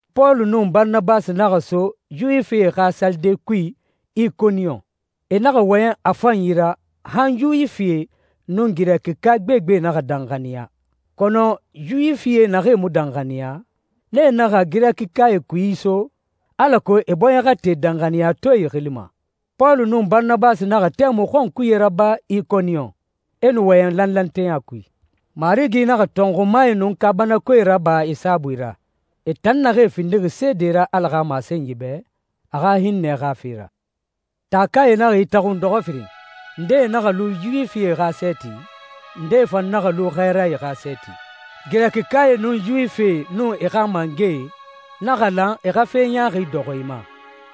Pɔlu nun Baranabasi naxa so Yuwifie xa salide kui Ikoniyon. E naxa wɔyɛn a fanyi ra han Yuwifie nun Girɛkika gbegbe naxa danxaniya. Kɔnɔ Yuwifie naxee mu danxaniya, nee naxa Girɛkikae kui iso, alako e bɔɲɛ xa te danxaniyatɔɛe xili ma. Pɔlu nun Baranabasi naxa tɛmui xɔnkuye raba Ikoniyon, e nu wɔyɛn lanlanteya kui. Marigi naxa tɔnxumae nun kaabanakoe raba e saabui ra, e tan naxee findixi seede ra Ala xa masenyi bɛ, a xa hinnɛ xa fe ra. Taakae naxa itaxun dɔxɔ firin. Ndee naxa lu Yuwifie xa sɛɛti, ndee fan naxa lu xɛɛrae xa sɛɛti. Girɛkikae nun Yuwifie nun e xa mangɛe naxa lan e xa fe ɲaaxi dɔxɔ e ma,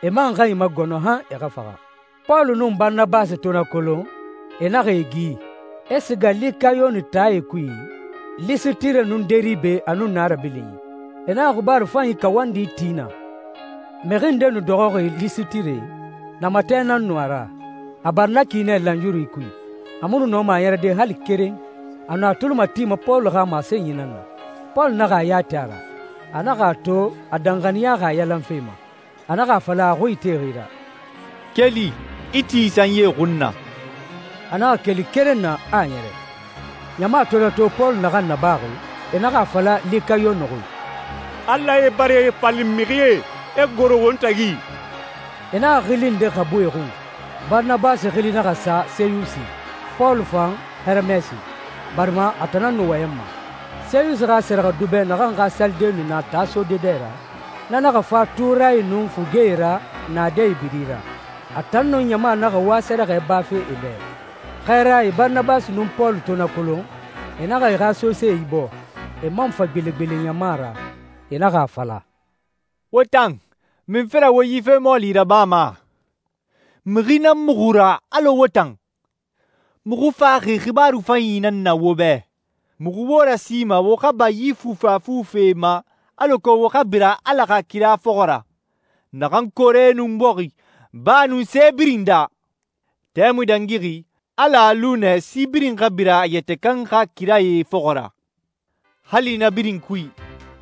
e man xa e magɔnɔ han e xa faxa. Pɔlu nun Baranabasi to na kolon, e naxa e gi, e siga Likayoni taae kui, Lisitire nun Deribe, a nun na rabilinyi. E naxa xibaaru fanyi kawandi ti naa. Mixi nde nu dɔxɔxi Lisitire, namatɛ nan nu a ra, a bari na ki nɛ lanyuru kui. A mu nu nɔma a ɲɛrɛde hali keren. A nu a tuli matima Pɔlu xa masenyi nan na. Pɔlu naxa a ya ti a ra. A naxa a to a danxaniyaxi a yalan fe ma. A naxa a fala a xui itexi ra, «Keli, i ti i sanyie xun na. A naxa keli keren na, a ɲɛrɛ.» Ɲama to na to, Pɔlu naxan nabaxi, e naxa a fala Likayoni xui, «Alae bara e falin mixie, e goro won tagi.» E naxa xili nde xabu e xun, e Baranabasi xili naxa sa Seyusi, Pɔlu fan Heremɛsi, barima a tan nan nu wɔyɛnma. Seyusi xa sɛrɛxɛdubɛ, naxan xa salide nu na taa sode dɛ ra, na naxa fa tuurae nun fugee ra naadɛe biri ra. A tan nun ɲama naxa wa sɛrɛxɛ bafe e bɛ. Xɛɛrae Baranabasi nun Pɔlu to na kolon, e naxa e xa sosee ibɔɔ, e man fa gbelegbele ɲama ra. E naxa a fala, «Wo tan, munfe ra wo yi fe mɔɔli rabama? Mixi nan muxu ra, alɔ wo tan. Muxu faxi xibaaru fanyi nan na wo bɛ. Muxu wo rasima wo xa ba yi fufafu fee ma alako wo xa bira Ala xa kira fɔxɔ ra, naxan koore nun bɔxi, baa nun se birin daa. Tɛmui dangixi Ala a lu nɛ si birin xa bira e yɛtɛ kan xa kirae fɔxɔ ra. Hali na birin kui,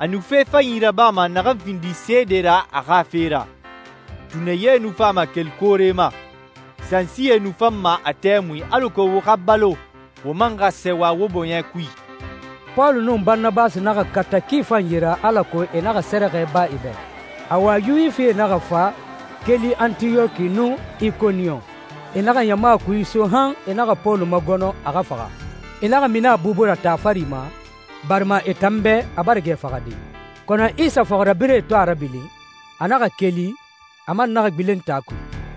a nu fe fanyi rabama naxan findi seede ra a xa fe ra. Tunɛ ye nu fama keli koore ma. Sansie nu fanma a tɛmui alako wo xa balo, wo man xa sɛɛwa wo bɔɲɛ kui.» Pɔlu nun Baranabasi naxa kata ki fanyi ra alako e naxa sɛrɛxɛ ba e bɛ. Awa, Yuwifie naxa fa keli Antiyɔki nun Ikoniyon. E naxa ɲama kui iso han e naxa Pɔlu magɔnɔ a xa faxa. E naxa mini a bubu ra taa fari ma barima e tan bɛ a bara gɛ faxade. Kɔnɔ Isa fɔxirabirɛe to a rabilin, a naxa keli, a man naxa gbilen taa kui.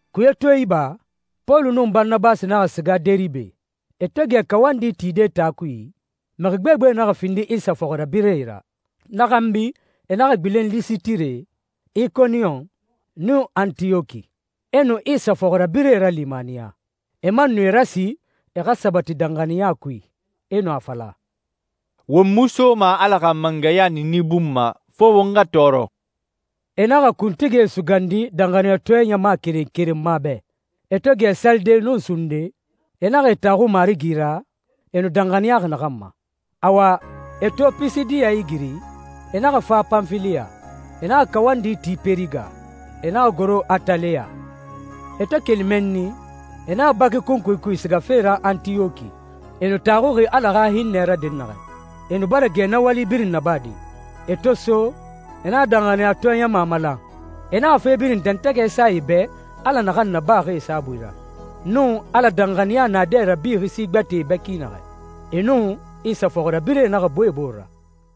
Kuye to iba, Pɔlu nun Baranabasi naxa siga Deribe. E to gɛ kawandi tide taa kui, mixi gbegbe naxa findi Isa fɔxirabirɛe ra. Na xanbi e naxa gbilen Lisitire, Ikoniyon, nun Antiyɔki. E nu Isa fɔxirabirɛe ralimaniya. E man nu e rasi e xa sabati danxaniya kui. E nu a fala, «Won mu soma Ala xa mangɛya niini bun ma fo won xa tɔɔrɔ.» E naxa kuntigie sugandi danxaniyatɔɛ ɲama keren keren ma bɛ. E to gɛ salide nun sunde, e naxa e taxu Marigi ra, e nu danxaniyaxi naxan ma. Awa, e to Pisidiya igiri, e naxa fa Panfiliya. E naxa kawandi ti Pɛriga, e naxa goro Ataleya. E to keli mɛnni, e naxa baki kunkui kui sigafe ra Antiyɔki, e nu taxuxi Ala xa hinnɛ ra dɛnnaxɛ. E nu bara gɛ na wali birin nabade. E to so, e naxa danxaniyatɔɛ ɲama malan. E naxa fe birin dɛntɛgɛ sa e bɛ Ala naxan nabaxi e saabui ra, nun Ala danxaniya naadɛ rabixi si gbɛtɛe bɛ ki naxɛ. E nun Isa fɔxirabirɛe naxa bu e bore ra.